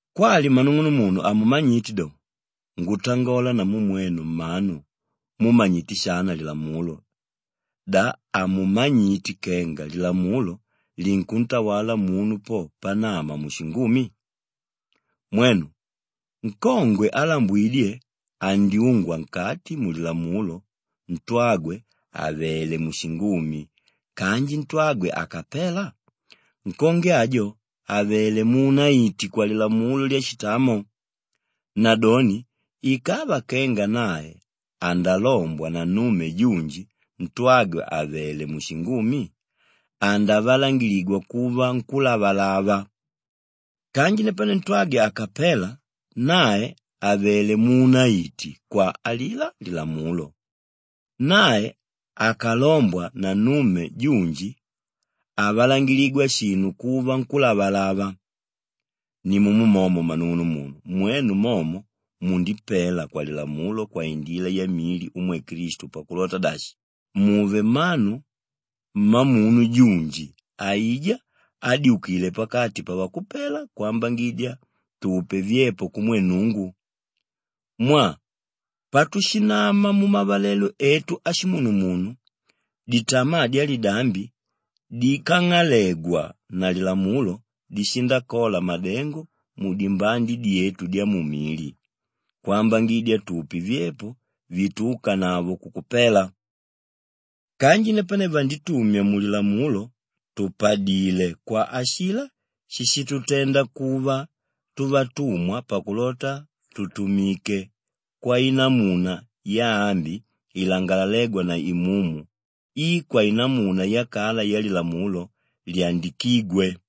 Kwali mmanung'unumunu hamumanyite do, ngutangola namu mwenu mmanu múmanyite shana lilamulo, da hamumanyite kenga lilamulo linkuntawala munu po panama mushingumi? Mwenu, nkongwe álambwidye andyuungwa nkati mulilamulo ntwagwe àvele mushingumi kanji ntwagwe akapela, nkongwe ajo avelé muunaiti kwalilamulo lyashitamo. Nadoni ikava kenga nae andalombwa na nnume junji ntwagwe àvele mushingumi, andavalangiligwa kuva nkúlavalava. Kanji napane ntwagwe akapela, nae avelé muunaiti kwa alilá lilamulo. Nae akalombwa na nnume junji, havalangiligwa shinu kuva nkúlavalava. Nimumo momo mmanung'unumunu mwenu momo mundipela kwalilamulo kwaindila yamili umwe Klistu pakulota dashi, muve mmanu mmamunu junji aijá ádyukile pakati pavakupela kwambangidya tupe vyepo kumwe Nnungu. Mwaa patushinama mumavalelo etu ashimunumunu, ditamaa dyalidambi dikang'alegwa na lilamulo dishindakola madengo mudimbande dyetu dyamumili kwambangidya tupe vyepo vituúkanavo kukupela. Kanji napane vanditumya mulilamulo tùpadile kwa ashilá shíshitutenda kuva tuvatumwa pakulota tutumike kwainamuna yaambi ilangalalégwa na Imumu i kwainamuna yakala yalilamulo lyandikígwe.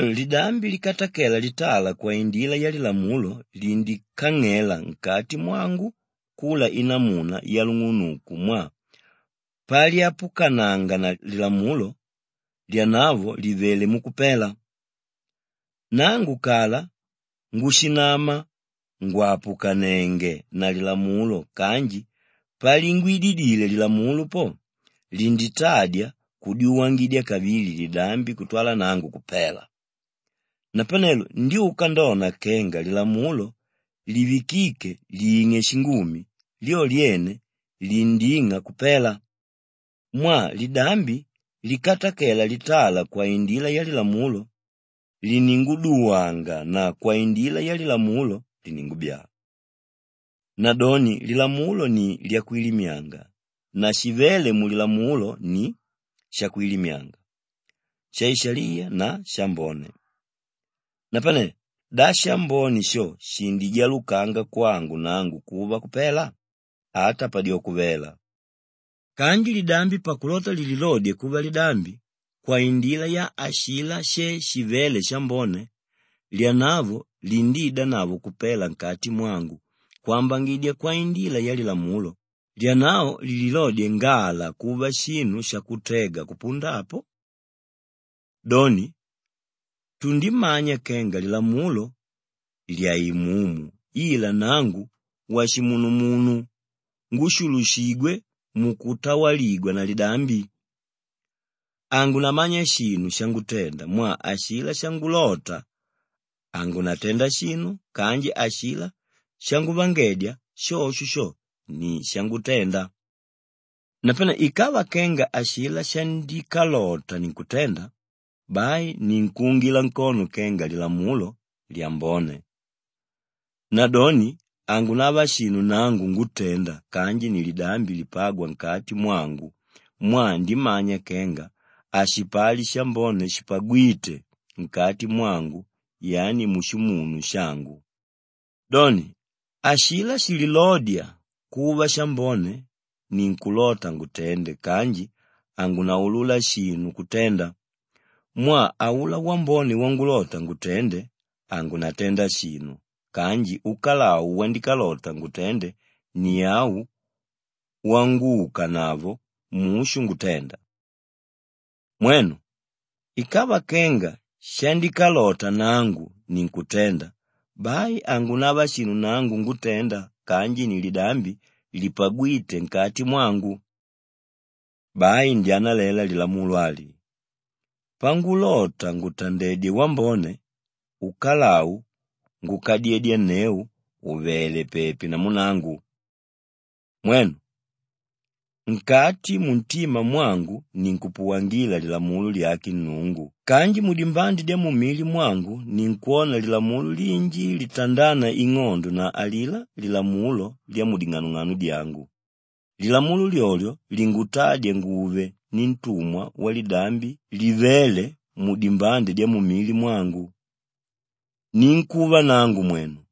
Napanelo lidambi likatakela litala kwaindila yalilamulo lindikang'ela nkati mwangu kula inamuna yalung'unuku mwaa palyapukananga na lilamulo, lyanavo livelé mukupela. Nangu kala ngushinama ngwàpukanenge na lilamulo kanji palingwidilile lilamulo po, linditadya kudyuwangidya kavili lidambi kutwala nangu kupela. Napanelo ndyuka ndona kenga lilamulo livikíke ling'e shingumi, lyo lyene linding'a kupela. Mwaa lidambi likatakela litala kwaindila yalilamulo, lininguduwanga na kwaindila yalilamulo, liningubyaa. Nadoni lilamulo ni lyakwilimyanga na shivéle mulilamulo ni shakwilimyanga, shaishaliya na shambone. Napane, da shambone sho shindijalukanga kwangu nangu kuva kupela? Ata padyoko vela! Kanji lidambi pakulota lililodye kuva lidambi, kwaindila ya ashilá she shivéle shambone, lyanavo lindiidanavo kupela nkati mwangu kwambangidya kwaindila yalilamulo, lyanavo lililodye ngala kuva shinu shakutega kupunda apo. Doni tundimanya kenga lilamulo lyàimumu ila nangu washimunumunu ngúshulushigwe mukutawaligwa na lidambi. Hangunamanya shinu shangutenda mwaa ashilá shangulota, hangunatenda shinu kanji ashilá shanguvangedya, shosho ni shangutenda. Napane ikava kenga ashilá shandikalota ninkutenda, bai ninkuungila nkono kenga lilamulo, lyambone. Nadoni hangunava shinu nangu ngútenda kanji ni lidambi lipágwa nkati mwangu mwaa ndimanya kenga hashipali shambone shipagwíte nkati mwangu yani mushimunu shangu. Doni, ashilá shililódya kuva shambone ninkulota ngutende kanji hangunaulula shinu kutenda mwaa aulá wambone wangulota ngutende hangunatenda shinu kanji ukalau wandikalota ngutende ni au wanguukanavo mushu ngutenda. Mwenu, ikava kenga shandikalota nangu ninkutenda, bai hangunava shinu nangu ngútenda kanji ni lidambi lipagwíte nkati mwangu. Bai ndyanalela lilamulo ali: pangulota ngutandedye wambone, ukalau ngukadyedyanneu ùvele pepi namu nangu. Mwenu, nkati muntima mwangu ninkupuwangila lilamulo lyake Nnungu kanji mudimbande dyamumili mwangu ninkwona lilamulo linji litandána ing'ondo na alilá lilamulo lyamuding'anong'ano dyangu, lilamulo lyolyo lingutádya nguve nintumwa walilamulo lyalidambi livéle mudimbande dyamumili mwangu. Ninkúva nangu mwenu!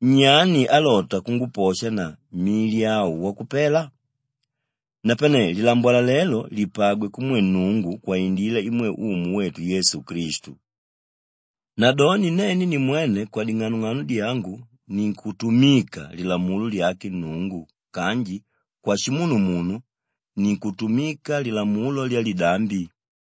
Nyani álota kunguposha na mili au wakupela? Napane lilambwalalelo lipagwe kumwe Nnungu kwaindila imwe Umu wetu Yesu Klistu. Nadoni nene nimwene kwading'anong'ano dyangu ninkutumika lilamulo lyake Nnungu kanji kwashimunumunu, ninkutumika lilamulo lyalidambi.